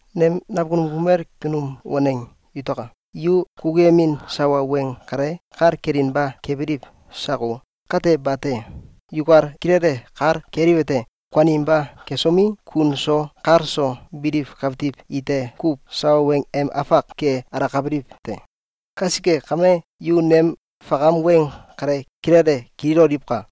Nem nakunum kumel kunum waneng yutaka! Yu kukuyemin sawa weng kale kal kelinba kebiliw sako? Kate bate! Yukal kilele kal keliwete: Kuaninba kesomi, kun so kal so biliw kawtiw ite kuw sawa weng em afak ke alakabiliw te. Kasike kame, yu nem fakam weng kale kilele kililoliwka!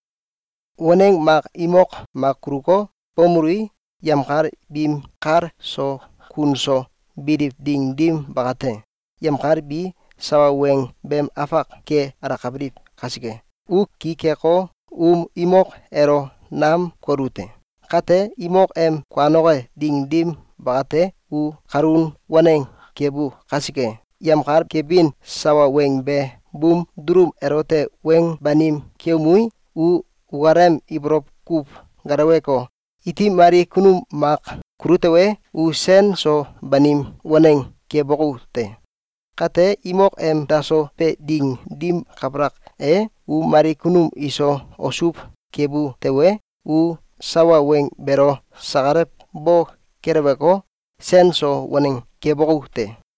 Waneng mak imok mak kuluko, bomelui, yemkal biim kal so kun so biliw ding dim bakate, yemkal bi sawa weng beem afak ke alakabiliw kasike, u ki keko, um imok elo nam kolu te. Kate, imok em kuanoke ding dim bakate, u kalun waneng kebu kasike, yemkal kebin sawa weng be buum dulum elote weng banim keumei, u ukalem ibolow kuw geleweko, iti mali kunum mak kulu tewe, u sen so banim waneng keboku te. Kate, imok em daso be ding dim kabalak e, u mali kunum iso osow kebu tewe, u sawa weng beelo sakalw bo keleweko, sen so waneng keboku te.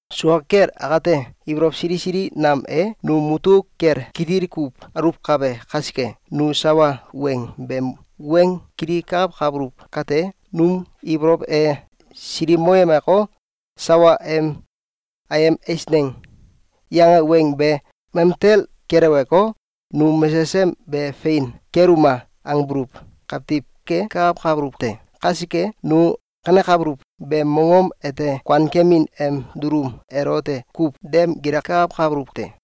Sua kel akate, ibolow sili sili nam e num mutuk kel kitil kuw aluwkabe kasike, nu sawa weng beem weng kilikakawkabuluw kate, num ibolow e silikmoyemeko, sawa em “Ayem eisneng!”, yange weng be, mamtel keleweko, “Nu mesesem be fein keluma!”, angbuluw kawtiw kekakawkabuluw te. Kasike, nu kanekabuluw beem mongom ete kuankemin em dulum elote kuw dem gilakakawkabuluw te.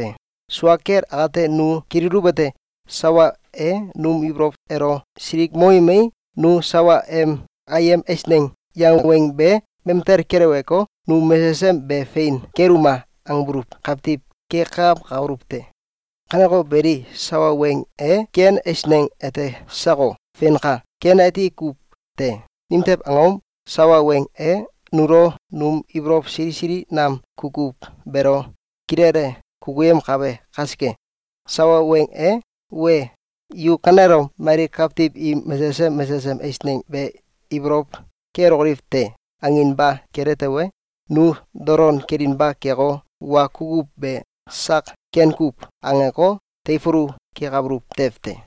Sua kel akate, nu kililuwete: Sawa e num ibolow elo silikmoyemei, nu sawa em “Ayem eisneng!”, yange weng be, mamtel keleweko, “Nu mesesem be fein keluma!”, angbuluw kawtiw kekakawkabuluw te. Kaneko beli, sawa weng e ken eisneng ete sako? Feinka! Ken ati kuw te! Nimtew angom? Sawa weng e nulo num ibolow sili sili nam kukuw beelo kilele kukuyemkabe kasike. Sawa weng e “Wee! Yu kanelom mali kawtiw im mesesem mesesem eisneng be ibolow kelokoliw te!”, anginba kele tewe, nu dolon kelinba keko, wa kukuw be sak “Ken kuw!”, angeko, teifulu kekabuluw tew te.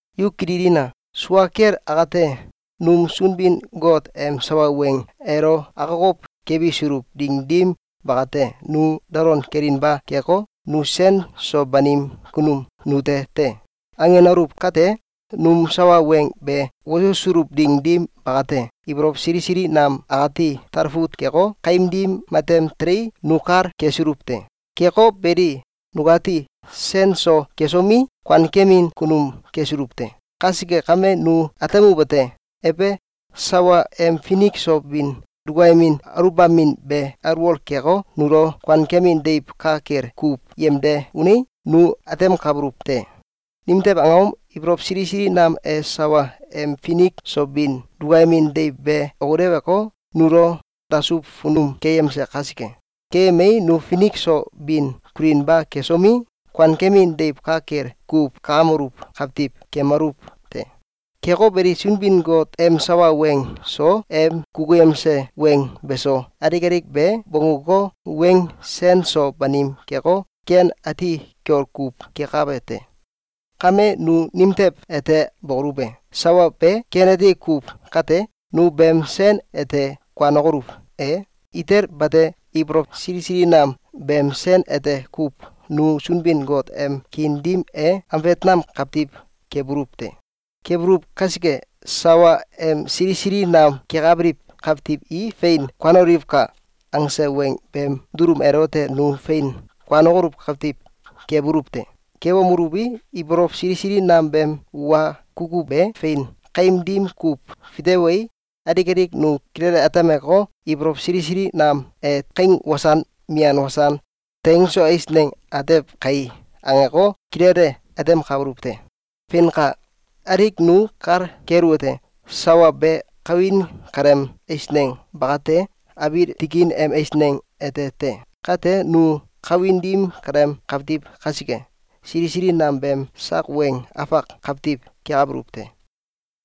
Yu kililina! Sua kel akate, num Sunbin-Got em sawa weng elo akokow kebisuluw ding dim bakate, nu dolon kelinba keko, “Nu sen so banim kunum nute te!”, angenaluw kate, num sawa weng be wosusuluw ding dim bakate, ibolow sili sili nam akati talfut keko, kaim dim matem telei, nu kal kesuluw te. Keko beli, nukati sen so kesomi, kuankemin kunum kesuluw te. Kasike kame, nu atemuwete: Ebe! Sawa em finik so bin dukayemin aluwbamin be alwol keko, nulo kuankemin deiw ka kel kuw yemde unei, nu atemkabuluw te. Nimtew angom? Ibolow sili sili nam e sawa em finik so bin dukayemin deiw be okileweko, nulo dasuw funum keyemse kasike. Keyemei, nu finik so bin kulinba kesomi, kuankemin deiw ka kel kuw kakameluw kawtiw kemaluw te. Keko beli, Sunbin-Got em sawa weng so, em kukuyemse weng beso, alik alik be bongguko, weng sen so banim keko, ken ati kiol kuw kekabe te. Kame, nu nimtew ete bokoluw e? Sawa be ken ati kuw kate, nu beem sen ete kuanokoluw e? Itel bate! Ibolow sili sili nam beem sen ete kuw nu Sunbin-Got em kiin dim e ambet nam kawtiw kebuluw te. Kebuluw kasike, sawa em “Sili sili nam kekabiliw kawtiw i fein kuanoliwka!”, angse weng beem dulum elote nu fein kuanokoluw kawtiw kebuluw te. Kebomeluwi, ibolow sili sili nam beem wa kukuw be fein kaim dim kuw fitewei, alik alik nu kilele atemeko, “Ibolow sili sili nam e kaing wasan mian wasan teng so eisneng atew kai!”, angeko, kilele atemkabuluw te. Feinka! Alik nu kal keluwete: Sawa be kawin kaleem eisneng ba kate, abiil tikin em eisneng ete te. Kate, nu kawin dim kaleem kawtiw kasike, sili sili nam beem sak weng afak kawtiw kekabuluw te.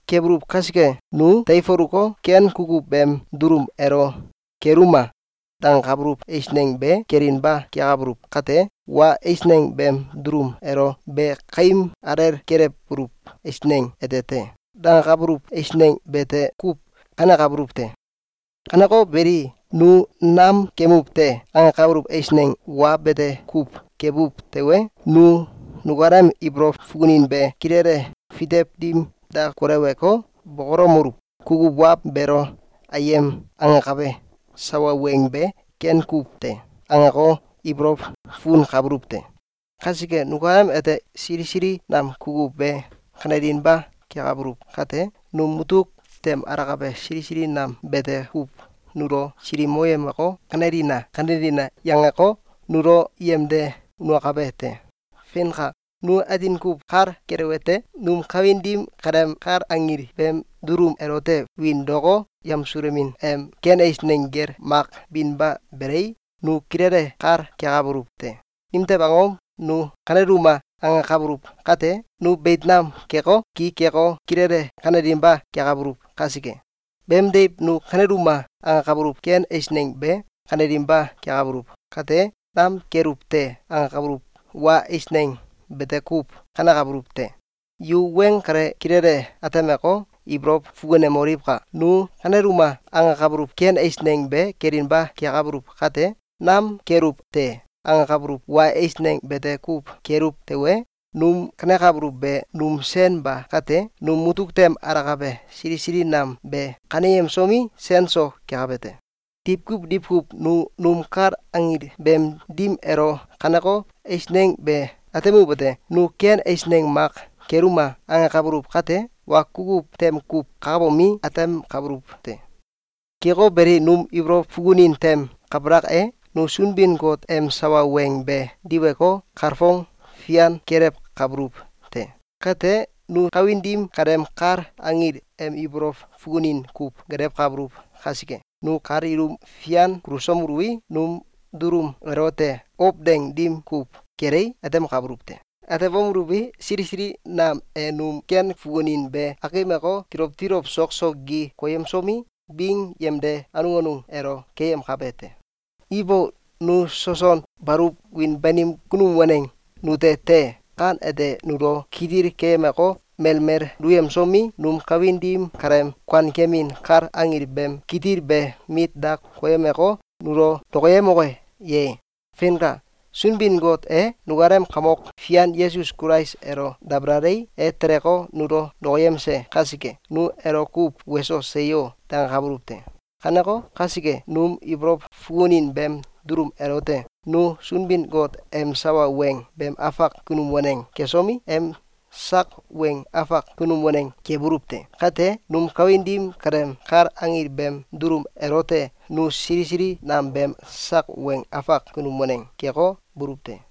Kebuluw kasike, nu teifuluko, ken kukuw beem dulum elo “Keluma!”, dangakabuluw eisneng be kelinba kekabuluw kate, wa eisneng beem dulum elo “Be kaim alel kelewbuluw eisneng ete te!”, dangakabuluw eisneng bete kuw kanekabuluw te. Kaneko beli, nu “Nam kemuw te!”, angekabuluw eisneng wa bete kuw kebuw tewe, nu nukalem ibolow fukunin be kilele fitew dim da koleweko, bokolomeluw: “Kukuw wa beelo ‘Ayem!’, angakabe sawa weng be ken kuw te.”, angeko, ibolow fukunkabuluw te. Kasike, nukalem ete sili sili nam kukuw be kanelinba kekabuluw kate, num mutuk tem alakabe sili sili nam bete kuw nulo silikmoyemeko, “Kanelina! Kanelina!”, yangeko, nulo yemde unakabe te. Feinka! Nu atin kuw kal keluwete: Num kawin dim kaleem kal anggil beem dulum elote wiin daoko, yamsulomin em ken eisneng gel mak binba belei, nu kilele kal kekabuluw te. Nimtew angom? Nu “Kaneluma!”, angakabuluw kate, nu beit nam keko, ki keko, kilele kanelinba kekabuluw kasike. Beemdiw, nu “Kaneluma!”, angakabuluw ken eisneng be kanelinba kekabuluw kate, “Nam keluw te!”, angakabuluw wa eisneng bete kuw kanekabuluw te. Yu weng kale kilele atemeko, ibolow fukunemoliwka! Nu “Kaneluma!”, angakabuluw ken eisneng be kelinba kekabuluw kate, “Nam keluw te!”, angakabuluw wa eisneng bete kuw keluw tewe, num kanekabuluw be num sen ba kate, num mutuk tem alakabe sili sili nam be kaneyemsomi, sen so kekabe te. Diwkuw diwkuw nu num kal anggil beem dim elo kaneko eisneng be atemuwete: Nu ken eisneng mak “Keluma!”, angakabuluw kate, wa kukuw tem kuw kakabomi, atemkabuluw te. Keko beli, num ibolow fukunin tem kabalak e, nu Sunbin-Got em sawa weng be diweko, kalfong fian kelewkabuluw te. Kate, nu kawin dim kaleem kal anggil em ibolow fukunin kuw gelewkabuluw kasike, nu kal ilum fian kulusomeluwi, num dulum elote ow deng dim kuw kelei, atemkabuluw te. Atebomeluwi, sili sili nam e num ken fukunin be akimeko, tilow tilow sok so gi koyemsomi, bing yemde anung anung elo keyemkabe te. Ibo! Nu soson baluw wiin banim kunum waneng nute te! Kan ete nulo kitil keyemeko, melmel duyemsomi, num kawin dim kaleem kuankemin kal anggil beem kitil be mit da koyemeko, nulo dokoyemoke ye? Feinka! Sunbin-Got e nukalem Kamok Fian Yesus Kulais elo dabalalei, e teleko, nulo dokoyemse kasike, nu elo kuw “Weso! Seyo!”, dangakabuluw te. Kaneko kasike, num ibolow fukunin beem dulum elote nu Sunbin-Got em sawa weng beem afak kunum waneng kesomi, em sak weng afak kunum waneng kebuluw te. Kate, num kawin dim kaleem kal anggil beem dulum elote nu sili sili nam beem sak weng afak kunum waneng keko, buluw te.